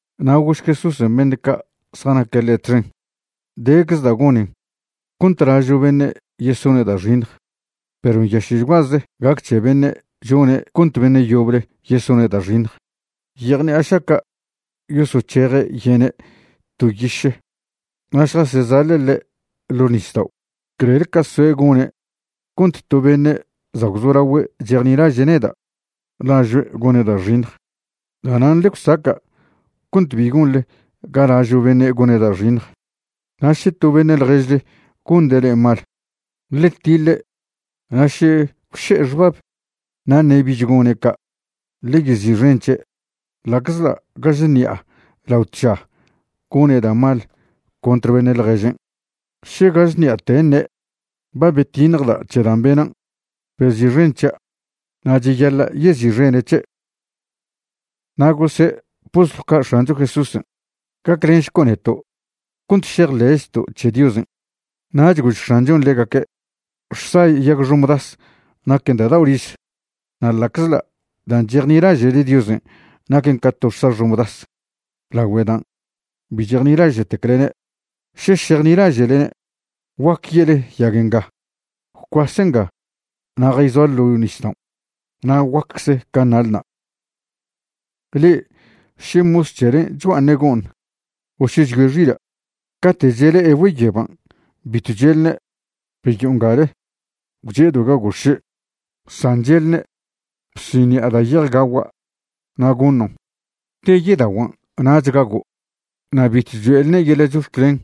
Na' gož Jesúsen' beṉe' ca' zjanaque' ḻe' txen: ―Decze da' gonen cont lažo' beṉe' yesone' da' xiṉj, perw nyaše'chguaze gac c̱he beṉe' chone' cont beṉe' yoble yesone' da' xiṉj. Yejṉi'a šaca' yosoc̱heje' yene' to yiše na' šjasezaḻe' ḻe' ḻo' nisdao' clel ca soe' gone' cont to beṉe' za' gwzolagüe' chejnilaže' neda' lažoe' gone' da' xiṉj. Da'nan' ḻe gwsaca' cont bi gonḻe ga lažo' beṉe' gone' da' xiṉj. ’Na' še to beṉe' ḻježle gonde' le'e mal, ḻe tiḻe' na' še gwše'e xbab na' ṉe' bich gone' ca', ḻe yezi'xen c̱he'. Ḻa'czḻa' gaž ṉi'a lao tža gone' da' mal contr beṉe' ḻježen', še gaž ṉi'ate ṉe': “Ba betiṉjda' c̱he dan' benan', bezi'xen c̱hia'”, na' cheyaḻa' yezi'xene' c̱he'. Na' gose' postlw ca' X̱ancho Jesúsen': ―Gaclenšco' neto' cont šejḻe'chto' c̱he Diosen'. Nach gož X̱anchon' ḻegaque': ―Xsa yag xomdas naquen da' dao' riz, na' ḻa'czḻa' dan' chejnilaže'le Diosen' naquen ca to xsa xomdas lagüe dan' bi chejnilaže'teclne', še šejnilaže'lne', guaque ye'le yag nga: “Gwcuase nga na' jayzoa ḻo' nisdaon'”, na' guaccze can' nalna'. ’Le'e še mos c̱helen' chgua'aṉe' go'ṉ, o še chyoe' xila', cate' chele'e güeyeban' bitw che'lne': “Beyo'o ngale, gwche'edo' gaguo' xše'.” San che'lne': “Bsiṉi'a da' ye'ej gagua' na' goṉon'. Te yedaguan' nach gago'.” Na' bitw cho'elne' yeḻa' chox̱clen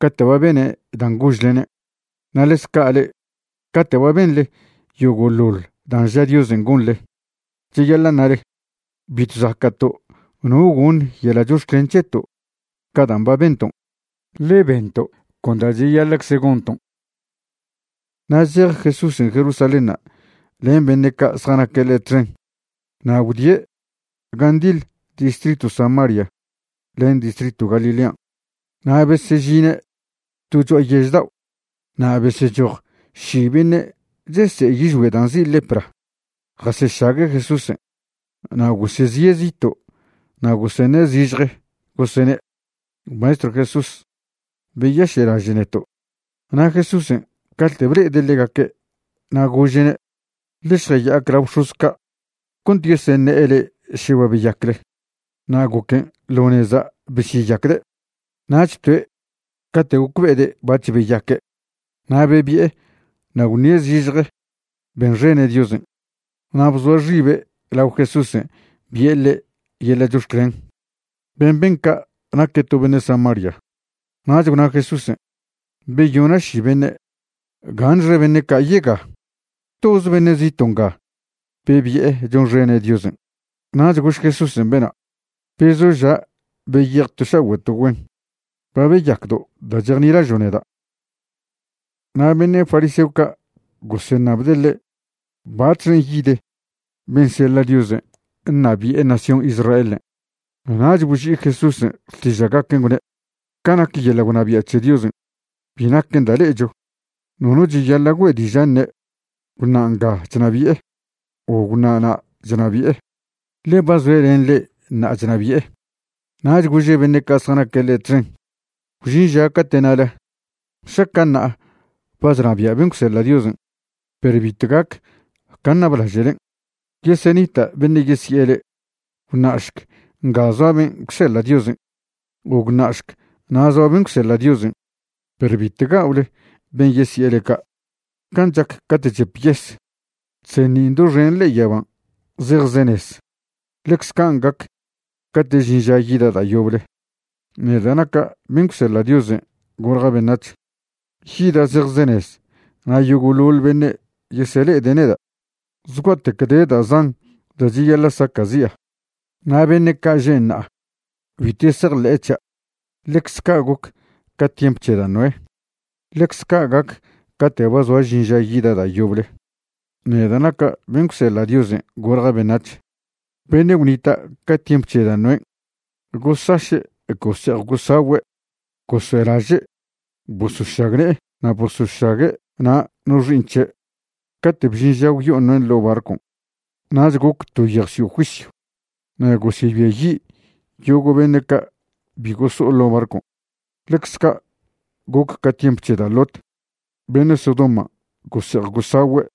cate' ba bene' dan' gožlene'. Na' ḻecz ca' le'e, cate' ba benḻe yogo'ḻoḻ dan' ža Diosen' gonḻe, cheyaḻa' ṉale: “Bitw zaca'to' no goṉ yeḻa' chox̱clen c̱heto' ca dan' ba bento', ḻe bento' con da' cheyaḻa'cze gonton'.” Na' zej Jesúsen' Jerusalénṉa' len beṉe' ca' zjanaque' ḻe' txen na' gwdie' gan' ndiḻ distritw Samaria len distritw Galilean'. Na' besežine' to cho'a yež dao' na' besechoj ši beṉe' chese'e yižgüe' da' nzi' lepra jasešague' Jesúsen'. Na' gosezie' zito' na' goseṉe' zižje gosene': ―Maestrw Jesús, beyaše'laže' neto'. Na' Jesúsen' cate' ble'ede' ḻegaque' na' gože'ne': ―Ḻe šjaya'ac lao bx̱oz ca' cont yeseṉe'e le'e še ba beyacle. Na' goquen' ḻo neza' besyeyacde'. Nach toe' cate' gocbe'ede' bac̱h beyaque', na' bebi'e na' gwṉie' zižje benxene' Diosen', na' bzoa xibe' lao Jesúsen' bi'e ḻe' yeḻa' chox̱clen. Ben' ben ca' naque' to beṉe' Samaria. Nach gwna Jesúsen': ―Beyona' ši beṉe'. ¿Gaṉxe beṉe' ca' yega? ¿Toz beṉe' zito' nga bebi'e chonxene' Diosen'? Nach gož Jesúsen' bena': ―Bezoža' beyej to šagüe' to güen. Ba beyacdo' da' chejnilažo' neda'. Na' beṉe' fariseo ca' goseṉabde' ḻe' batxen' yid ben' seḻa' Diosen' ṉabi'e nación Israelen'. Nach boži'i Jesúsen' xtiža'gaquen' gwne': ―Ca nac yeḻa' gwnabia' c̱he Diosen', bi naquen da' le'echo. Nono cheyaḻa' güe' diža' ṉe': “Gwṉa' nga chnabi'e”, o “Gwṉa' na' chnabi'e.” Ḻe ba zoe' len le'e ṉa'a chnabi'e. Nach gože' beṉe' ca' zjanaque' ḻe' txen: ―Gwžin ža cate' ṉale: “Šaca' ṉa'a ba chnabia' ben' gwseḻa' Diosen'”, perw bitw gac can' ṉablaže'len'. Yesenita' beṉe' yesi'e le'e: “Gwṉa'šc nga zoa ben' gwseḻa' Diosen'”, o “Gwṉa'šc na' zoa ben' gwseḻa' Diosen'.” Perw bitw ga'ole ben' yesi'e le'e ca'. Can' chac cate' chep yes, chseṉin' doxen ḻe'e yaban' zejzenez, ḻecze can' gac cate' žin ža yida' da' yoble, neda' naca' ben' gwseḻa' Diosen' golja' beṉac̱h. Yida' zejzenez na' yogo'ḻoḻ beṉe' yesele'ede' neda'. Zgua'tec de da' zan da' cheyaḻa' saca'zi'a na' beṉe' ca' že' ṉa'a bitw yesejḻe'e c̱hia'. Ḻecz ca' goc ca tiemp c̱he da' Noé, ḻecze ca' gac cate' ba zoa žin ža yida' da' yoble, neda' naca' ben' gwseḻa' Diosen' golja' beṉac̱h. Beṉe' gwnita' ca tiemp c̱he da' Noén' gosaše' gose'ej gosagüe' goso'elaže' bosošagne'e na' bosošague' na' no xi'iṉ c̱he' cate' bžin ža gwyo'o Noén' ḻo' barcon'. Nach goc to yejwsio' juisyw. Na' gosebiayi' yogo' beṉe' ca' bi goso'o ḻo' barcon'. Ḻecz ca' goc ca tiemp c̱he da' Lot, beṉe' Sodoman' gose'ej gosagüe'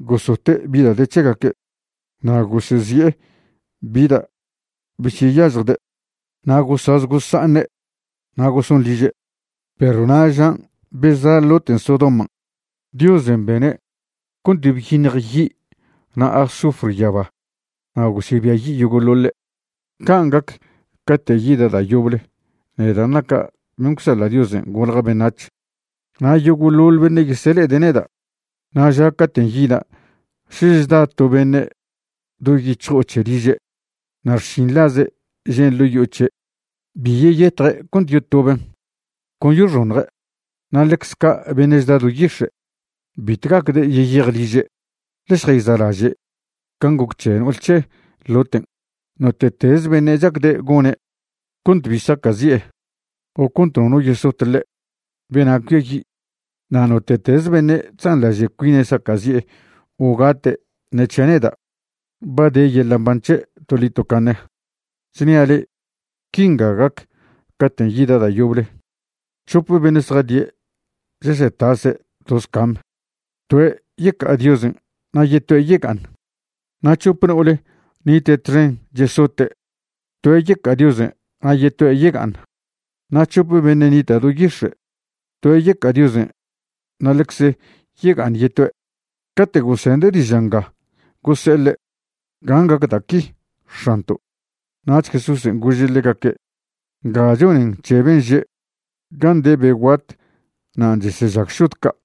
gosote' bi da' de c̱hegaque', na' gosezi'e bi da' beseyažjde', na' gosaz gosa'aṉe', na' goson liže'. Perw na' žan' beza' Loten' Sodoman', Diosen' bene' cont byiṉj yi' na' azufre yaba na' gosebiayi' yogo'ḻoḻe'. Can' gac cate' yida' da' yoble, neda' naca' ben' gwseḻa' Diosen' golja' beṉac̱h, na' yogo'ḻoḻ beṉe' yesele'ede' neda'. ’Na' ža caten' yida' še chda to beṉe' do yic̱hjo'o c̱he liže', na' xšinḻaze' žen' ḻo' yo'o c̱he', bi yeyetje' cont yotoben', con yoxoṉje'. Na' ḻecze ca' beṉe' chda do yix̱e', bitw gacde' yeyej liže'. Ḻe šjayza'laže' can' goc c̱he no'ol c̱he Loten'. Note'tez beṉe' chacde' gone' cont cbi saca'zie' o cont nono yesot ḻe', bena' cuiayi'. Na' note'tez beṉe' chzanḻaže' cuine' saca'zie' o gate' ṉe c̱hia' neda', ba de yeḻa' mban c̱he' toḻi tocaṉe. ’Chnia' le'e, quinga gac caten' yida' da' yoble. C̱hope beṉe' zjadie' chesetase' toz cam. Toe' yeca'a Diosen' na' yetoe' yega'aṉ. Na' c̱hop no'ole nite' txen chesote', toe' yeca'a Diosen' na' yetoe' yega'aṉ. Na' c̱hope beṉe' nite' do yix̱e', toe' yeca'a Diosen' na' ḻecze yega'aṉ yetoe'. Cate' gosende' diža' nga gose'e ḻe': ―¿Gan' gac da' qui, X̱anto'? Nach Jesúsen' gože' ḻegaque': ―Nga chonen c̱he ben' že': “Gan' de be guat nan' chesežag šod ca'.”